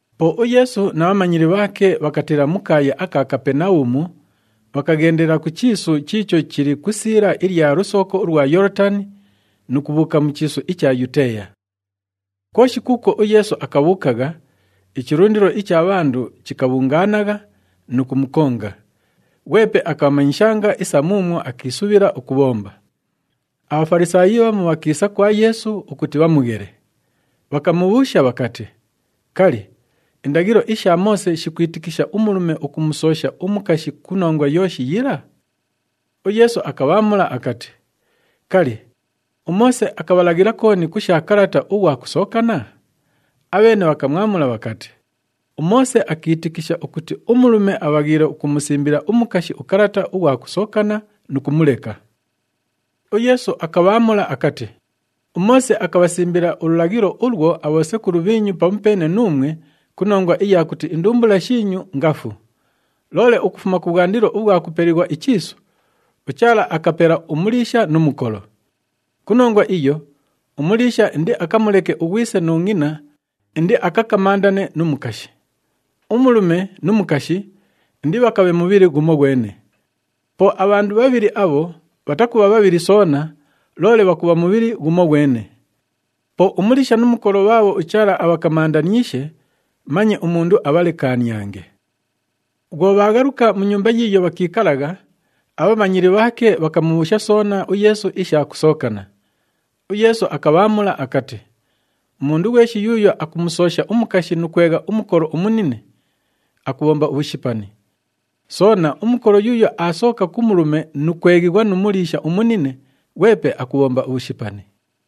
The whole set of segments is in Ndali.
Po uYeesu na bhamanyili bhaake bhakatiila mu kaaya aka Kapenabhumu, bhakaghendela ku chiisu chiicho chili ku isiila ilya lusooko ulwa Yoolotani nu kubhuuka mu chiisu icha Yuteeya. Kwoshi kuukwo uYeesu akabhuukagha, ichilundilo icha bhandu chikabhungaanagha nu kumukonga, ghwepe akabhamanyishanga isa muumwo akiisubhila ukubhomba. ABhafalisaayi bhamu bhakiisa kwa Yeesu ukuti bhamughele, bhakamubhuusha bhakati, “Kali, indaghilo isha Moose shikwitikisha umulume ukumusoosha umukashi ku nongwa yooshi yila?” UYeesu akabhaamula akati, “Kali, uMoose akabhalaghila kooni ku sha kalata ughwa kusookana?” Abheene bhakamwamula bhakati, “UMoose akiitikisha ukuti umulume abhaghiile ukumusimbila umukashi ukalata ughwa kusookana nu kumuleka.” UYeesu akabhaamula akati, “UMoose akabhasimbila ululaghilo ulwo abhosekulu bhiinyu pamupeene nuumwe ku nongwa iya kuti indumbula shiinyu ngafu. Loole ukufuma kubhwandilo ubhwa kupelighwa ichiisu, ‘UChaala akapela umuliisha nu mukolo.’ Ku nongwa iyo, umuliisha indiakamuleke ughwise nu ngʼina, indiakakamandane nu mukashi. Umulume nu mukashi indibhakabhe mubhili ghumoghwene. Po abhandu bhabhili abho bhatakubha bhabhili soona, loole bhakubha mubhili ghumoghwene. Po umuliisha nu mukolo bhaabho uChaala abhakamandaniishe, manye umundu abhalekaaniange.” Bhwo bhaaghaluka mu nyumba yiiyo bhakiikalagha, abhamanyili bhaake bhakamubhuusha soona uYeesu isha kusookana. UYeesu akabhaamula akati, “Umundu ghweshi yuuyo akumusoosha umukashi nu kwegha umukolo umunine, akubhomba ubhushipani. Soona, umukolo yuuyo aasooka ku mulume nu kweghighwa nu muliisha umunine, ghwepe akubhomba ubhushipani.”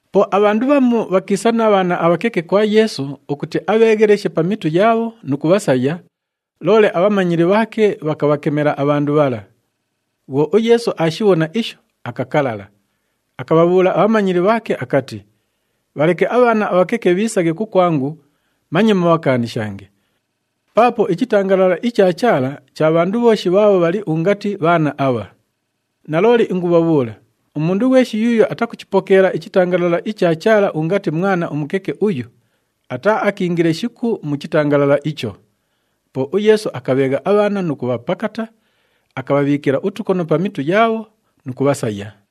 Po abhandu bhamu bhakiisa na bhaana abhakeke kwa Yeesu ukuti abheegheleshe pa mitu yaabho nu kubhasaya, loole abhamanyili bhaake bhakabhakemela abhandu bhala. Bhwo uYeesu aashibhona isho, akakalala. Akabhabhuula abhamanyili bhaake akati, “Bhaleke abhaana abhakeke bhiisaghe kukwangu, manye mubhakaanishange. Paapo ichitangalala icha Chaala cha bhandu bhooshi bhaabho bhali ungati bhaana abha. Nalooli ingubhabhuula, umundu ghweshi yuuyo atakuchipokeela ichitangalala icha Chaala ungati mwana umukeke uyu, ataaakiingile shiku mu chitangalala icho.” Po uYeesu akabheegha abhaana nu kubhapakata, akabhabhiikila utukono pa mitu yaabho nu kubhasaya.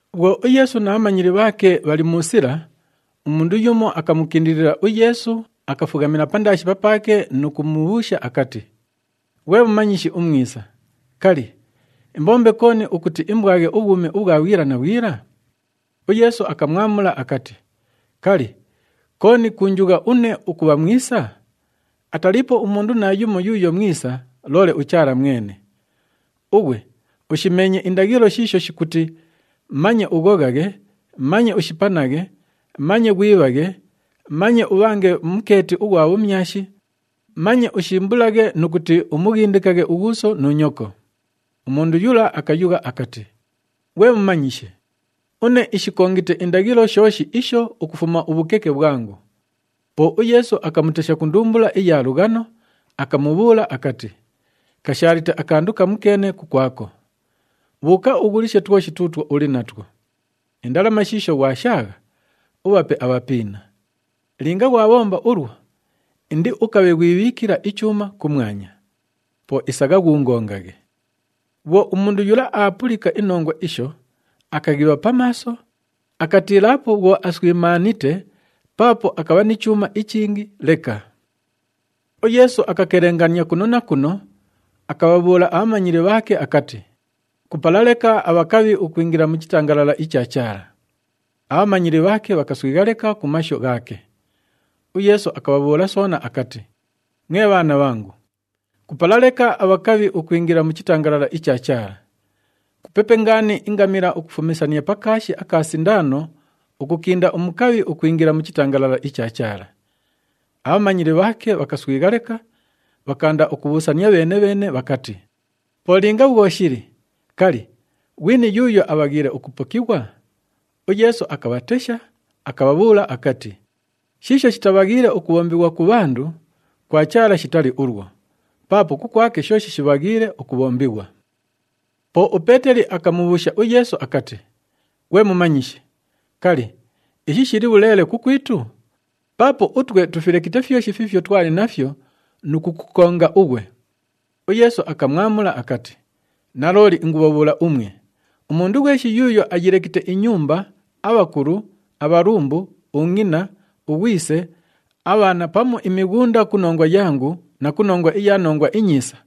Bhwo uYeesu na bhamanyili bhaake bhali mu sila, umundu yumo akamukindilila uYeesu, akafughamila pandaashi papaake nu kumubhuusha akati, “Ghwe Mumanyishi umwisa, kali, imbombe kooni ukuti imbwaghe ubhwumi ubhwa bhwila na bhwila?” UYeesu akamwamula akati, “Kali, kooni kuunjugha une ukubha mwisa? Ataliipo umundu naayumo yuuyo mwisa, loole uChaala mwene. Ughwe ushimeenye indaghilo shiisho shikuti, ‘Manye ughoghaghe, manye ushipanaghe, manye ghwibhaghe, manye ubhange mukeeti ughwa bhumyashi, manye ushimbulaghe nu kuti umughindikaghe ughuuso nu nyoko.’” Umundu yula akayugha akati, “Ghwe Mumanyishi, une ishikongite indaghilo shooshi isho ukufuma ubhukeke bhwangu.” Po uYeesu akamutesha ku ndumbula iya lughano, akamubhuula akati, “Kashaalite akandu kamukeene kukwako. Bhuuka ughulishe twoshi tuutwo uli natwo. Indalama shiisho ghwashaagha, ubhape abhapiina. Linga ghwabhomba ulwo, indiukabhe ghwibhiikila ichuuma kumwanya. Po isagha ghuungongaghe.” Bhwo umundu yula aapulika inongwa isho, akaghibha pa maaso, akatiilaapo bhwo aswimaanite paapo akabha ni chuuma ichingi leka. UYeesu akakelengania kuno na kuno, akabhabhuula abhamanyili bhaake akati, “Kupala leka abhakabhi ukwingila mu chitangalala icha Chaala.” Abhamanyili bhaake bhakaswigha leka ku mashu ghaake. UYeesu akabhabhuula soona akati, “Mwe bhaana bhangu, kupala leka abhakabhi ukwingila mu chitangalala icha Chaala! Kupepe ngaani ingamila ukufumisania pa kaashi aka sindaano, ukukinda umukabhi ukwingila mu chitangalala icha Chaala.” Abhamanyili bhaake bhakaswigha leka, bhakaanda ukubhuusania bheene-bheene bhakati, “Po linga bhwo shili, kali, ghwini yuuyo abhaghiile ukupokighwa?” UYeesu akabhatesha, akabhabhuula akati, “Shiisho shitabhaghiile ukubhombighwa ku bhandu, kwa Chaala shitali ulwo, paapo kukwake shooshi shibhaghiile ukubhombighwa.” Po uPeeteli akamubhuusha uYeesu akati, “Ghwe Mumanyishi, kali, ishi shili bhuleele kukwitu? Paapo utwe tufilekite fyoshi fiifyo twali nafyo nu kukukonga ughwe!” UYeesu akamwamula akati, “Nalooli ingubhabhuula umwe, umundu ghweshi yuuyo ayilekite inyumba, abhakulu, abhalumbu, ungʼina, ughwise, abhaana pamu imighunda ku nongwa yangu na ku nongwa iya Nongwa iNyiisa,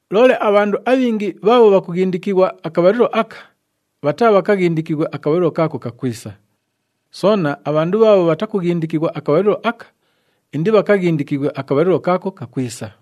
Loole abhandu abhingi bhaabho bhakughindikighwa akabhalilo aka, bhataabhakaghindikighwe akabhalilo kaako kakwisa. Soona, abhandu bhaabho bhatakughindikighwa akabhalilo aka, indibhakaghindikighwe akabhalilo kaako kakwisa.”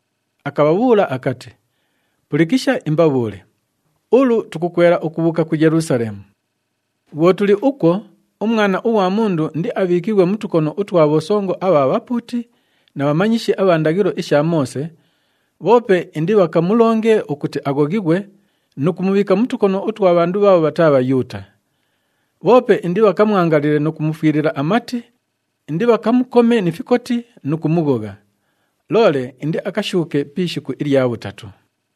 Akabhabhuula akati, “Pulikisha imbabhuule! Ulu, tukukwela ukubhuuka ku Yelusaleemu. Bhwo tuli ukwo, uMwana ughwa Mundu indiabhiikighwe mu tukono utwa bhosongo abha bhapuuti na bhamanyishi abha ndaghilo isha Moose, bhoope indibhakamulonge ukuti aghoghighwe nu kumubhiika mu tukono utwa bhandu bhaabho bhataa Bhayuuta. Bhoope indibhakamwangalile nu kumufwilila amati, indibhakamukome ni fikoti nu kumughogha. Loole indiakashuuke pi ishiku ilya bhutatu.”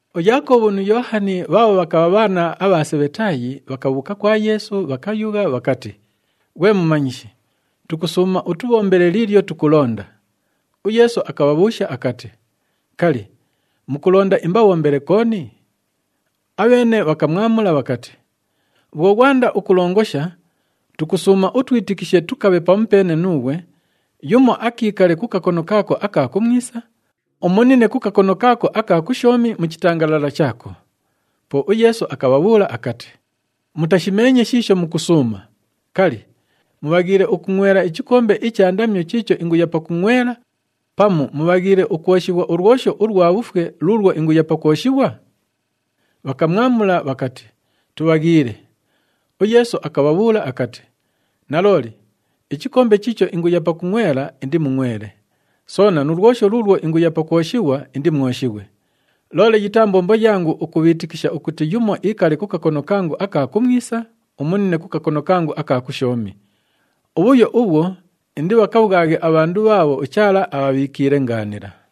UYaakobhu nu Yoohani bhaabho bhakabha bhaana abha Sebhetaayi, bhakabhuuka kwa Yeesu bhakayugha bhakati, “Ghwe Mumanyishi, tukusuuma utubhombele liilyo tukulonda.” UYeesu akabhabhuusha akati, “Kali, mukulonda imbabhombele kooni?” Abheene bhakamwamula bhakati, “Bhwo ghwanda ukulongosha, tukusuuma utwitikishe tukabhe pamupeene nuughwe, yumo akiikale ku kakono kaako aka kumwisa, umunine ku kakono kaako aka kushoomi mu chitangalala chaako.” Po uYeesu akabhabhuula akati, “Mutashimeenye shiisho mukusuuma. Kali, mubhaghiile ukungʼwela ichikombe icha ndamyo chiicho inguya pakungʼwela pamu mubhaghiile ukwoshighwa ulwosho ulwa bhufwe luulwo inguya pakwoshighwa?” Bhakamwamula bhakati, “Tubhaghiile.” UYeesu akabhabhuula akati, “Nalooli, ichikombe chiicho inguya pakungʼwela indimungʼwele, soona nu lwosho luulwo inguya pakwoshighwa indimwoshighwe. Loole yitaa mbombo yangu ukubhiitikisha ukuti yumo iikale ku kakono kangu aka kumwisa, umunine ku kakono kangu aka kushoomi. Ubhuyo ubhwo indibhakabhwaghe abhandu bhaabho uChaala abhabhiikiile ngaanila.”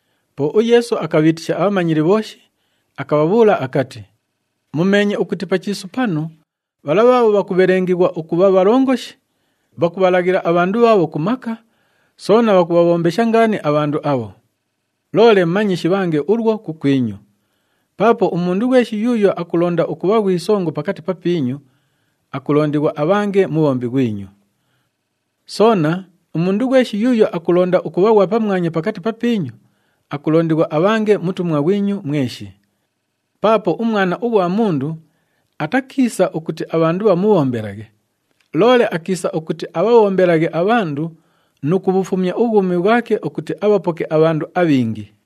Po uYeesu akabhiitisha abhamanyili bhooshi, akabhabhuula akati, “Mumeenye ukuti pa chiisu panu, bhala bhaabho bhakubhelengelighwa ukubha bhalongoshi, bhakubhalaghila abhandu bhaabho ku maka, soona bhakubhabhombesha ngaani abhandu abho. Loole manye shibhange ulwo kukwinyu. Paapo umundu ghweshi yuuyo akulonda ukubha ghwi songo pakati papiinyu, akulondighwa abhange mubhombi ghwinyu. Soona, umundu ghweshi yuuyo akulonda ukubha ghwa pamwanya pakati papiinyu, akulondighwa abhange mutumwa ghwinyu mweshi. Paapo uMwana ughwa Mundu atakiisa ukuti abhandu bhamubhombelaghe, loole akiisa ukuti abhabhombelaghe abhandu nu kubhufumya ubhwumi bhwake ukuti abhapoke abhandu abhingi.”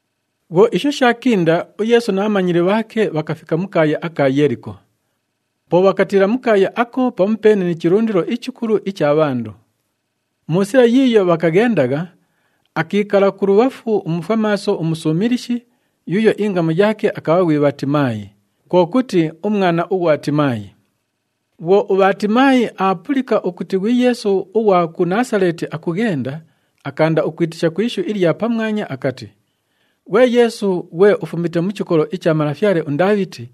Bhwo isho shaakinda, uYeesu na bhamanyili bhaake bhakafika mu kaaya aka Yeeliko. Po bhakatiila mu kaaya ako pamupeene ni chilundilo ichikulu icha bhandu. Mu sila yiiyo bhakaghendagha, akiikala kulubhafu umufwamaaso umusuumilishi yuuyo ingamu yaake akabha ghwi Bhaatimaayi, kwo kuti, “Umwana ughwa Timaayi.” Bhwo uBhaatimaayi aapulika ukuti ghwi Yeesu ughwa ku Naasaleeti akughenda, akaanda ukwitisha ku ishu ilya pamwanya akati, “Ghwe Yeesu, ghwe ufumite mu chikolo icha malafyale uNdaabhiti,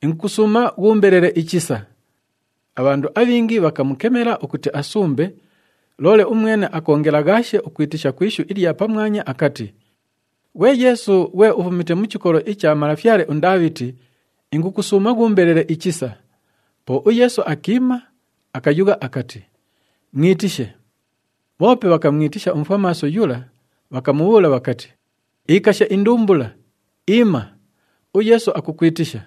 ingukusuuma ghuumbelele ichisa!” Abhandu abhingi bhakamukemela ukuti asumbe, loole umwene akoongelaghaashe ukwitisha ku ishu ilya pamwanya akati, “Ghwe Yeesu, ghwe ufumite mu chikolo icha malafyale uNdaabhiti, ingukusuuma ghuumbelele ichisa!” Po uYeesu akiima, akayugha akati, “Mwitishe.” Bhoope bhakamwitisha umufwamaaso yula, bhakamubhuula bhakati, “Ikasha indumbula! Iima. UYeesu akukwitisha.”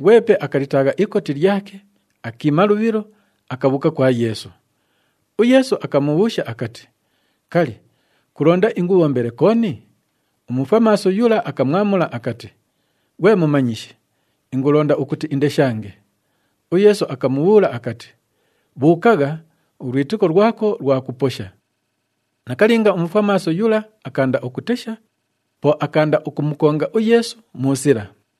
Ghwepe akalitaagha ikoti lyake, akiima lubhilo, akabhuuka kwa Yeesu. UYeesu akamubhuusha akati, “Kali, kulonda ingubhombele kooni?” Umufwamaaso yula akamwamula akati, “Ghwe Mumanyishi, ingulonda ukuti indeshange.” UYeesu akamubhuula akati, “Bhuukagha, ulwitiko lwako lwakuposha.” Nakalinga, umufwamaaso yula akaanda ukutesha, po akaanda ukumukonga uYeesu mu sila.